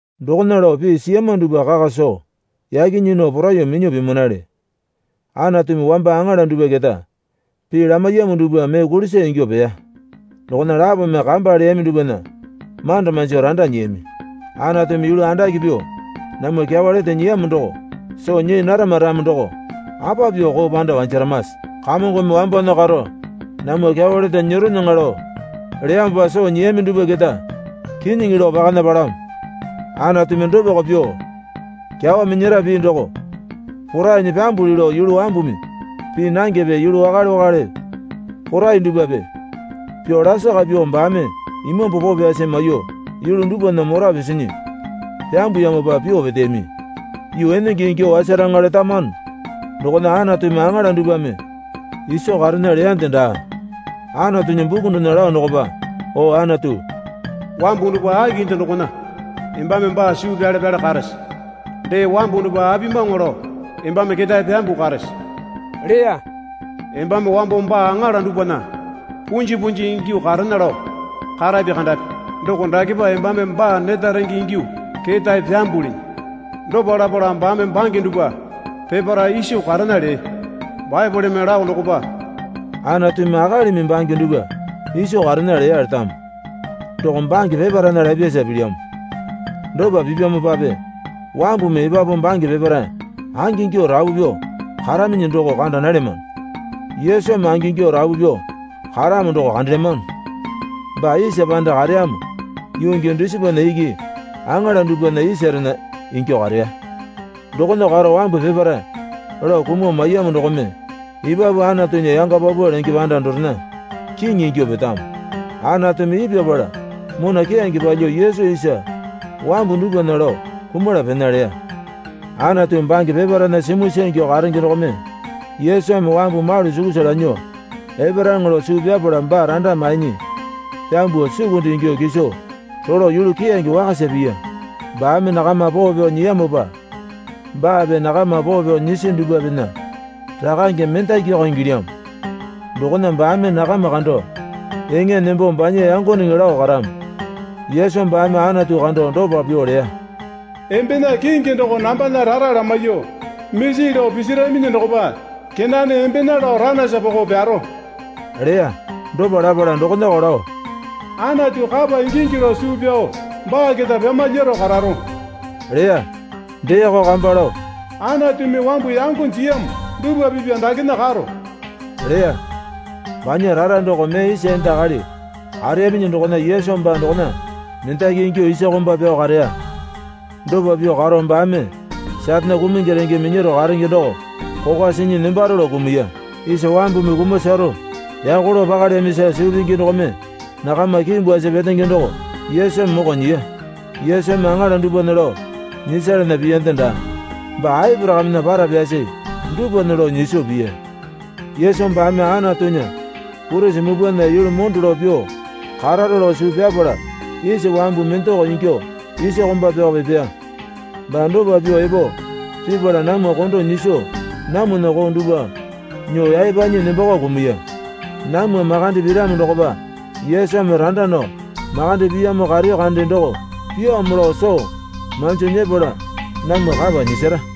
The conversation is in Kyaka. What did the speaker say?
Dokona lao pii siyama dupwa kaka soo yaki nyii nao poraiyuo minyuo pimanale. Anatumi wamba aŋala dupwa keta pii lamaiyamo dupwa mee kulisa ingyuo peya. Dokona lapome kamba leyami dupwana manda manjo randa nyiyami. Anatumi yulu andake pyuo namwa kyawa lete nyiyamo doko soo nyii narama ramo doko apa pyuo koo panda wanjaramase? Kamongome wambowana karo namwa kyawa lete nyeronyaŋa lao leyamopa soo nyiyami dupwa keta kinyiŋi lao pakana palamo. Anatumi dopako pyuo kyawa minyara pii doko porainyi pyambuli lao yulu wambumi pii nangepe yulu wakale wakale porai dupwape pyuo lasaka pyuo baame Imambu Poo Pyasi maiyuo yulu dupwana mora pisinyi pyambuyamopa pyuo peteyami. Yuu enenge ingyuo wasaraŋa letamano dokona Anatumi aŋala dupwame iso karena leyande daa. Anatunya buku dokona lao dokopa O Anatu, wambu dupwa akinde dokona embame baa suu pyale pyale karese? Dee wambu dupwa apimawaŋa lao embame ketae pyambuo karese? leya. Embame wambo baa aŋala dupwana punji punji ingyuo karena lao karapi kandape doko dakepa embame baa neta renge ingyuo ketae pyambulinyi. Dopa lapala baame bange dupwa peparae iso karena lee. Baepoleme lao dokopa, Anatumi akalimi bange dupwa iso karena leya letamo. Doko bange peparaena lapyasa pilyamo. Dopa pipyamopape wambumi epapu bange peparae angingyuo rapu pyuo karaminyi doko kanda nalyamano. Yesumi angingyuo rapu pyuo karamo doko kandelyamano. Baa isa panda kareyamo yuu gii dusipana iki aŋala dupwana isarena ingyuo kareya. Dokona karo wambu peparae lao kumuo maiyamo dokome epapu Anatunya yanga paupau lenge panda dorena Kiŋi ingyuo petamo. Anatumi ipyapala mona keyange palyuo Yesu isa wambu dupwana lao kumala pena leya. Anatu bange peparaena simuisa ingyuo karenge dokome Yesumi wambu malu sukusa lanyuo eparaŋa lao suu pyapala baa randa mainyi pyambuo sukunde ingyuo kiso rolo yulu keyange wakasa piya. Baame nakama poo pyao nyiyamopa baape nakama poo pyao nyisi dupwapena Rakange mendakioko ingilyamo. Dokona baame nakama kando eŋa nembo banya yangoneŋe lao karamo. Yesu baame Anatu kando dopa pyuo leya. Embena kingi doko nambana rara lamaiyuo. Misi lao pisaraminyi dokopa kenane Embena lao ranaisa poko pyaro leya. Dopa lapala dokonako lao, Anatu kapa ingingi lao suu pyao baa keta pyamalyaro kararo leya. Deeko kamba lao, Anatumi wambu yango jiyamo dupwa pipa dakena karo leya. Banya rara doko mee isa enda akali kareyaminyi dokona Yesu baa dokona mendali ingyuo isa komba pyao kareya. Dopa pyuo karo baame Satane kumungi renge minyaro karenge doko kokwa sinyi nembaro lao kumuya. Isa wambumi kumasaro yako lao pakalyamisa suu pingi dokome nakama kiimbwasi petenge doko Yesumi moko nyiya. Yesumi aŋala dupwana lao nyisalana piyande daa. Baa Aporakamena para pyasi dupwana lao nyiso piya. Yesu baame Anatunya Purisi Mupwana yulu mondo lao pyuo kararo lao suu pyapala isa wambu mendako ingyuo isa komba pyao epeya. Baa dopa pyuo epo pipala namwa kondo nyiso namwana koo dupwa nyuo yaepanyi nembako kumuya. Namwa makande piramo dokopa Yesumi randa nao makande piyamo kareyo kande doko pyaamo lao soo manji nyepala namwa kapa nyisara.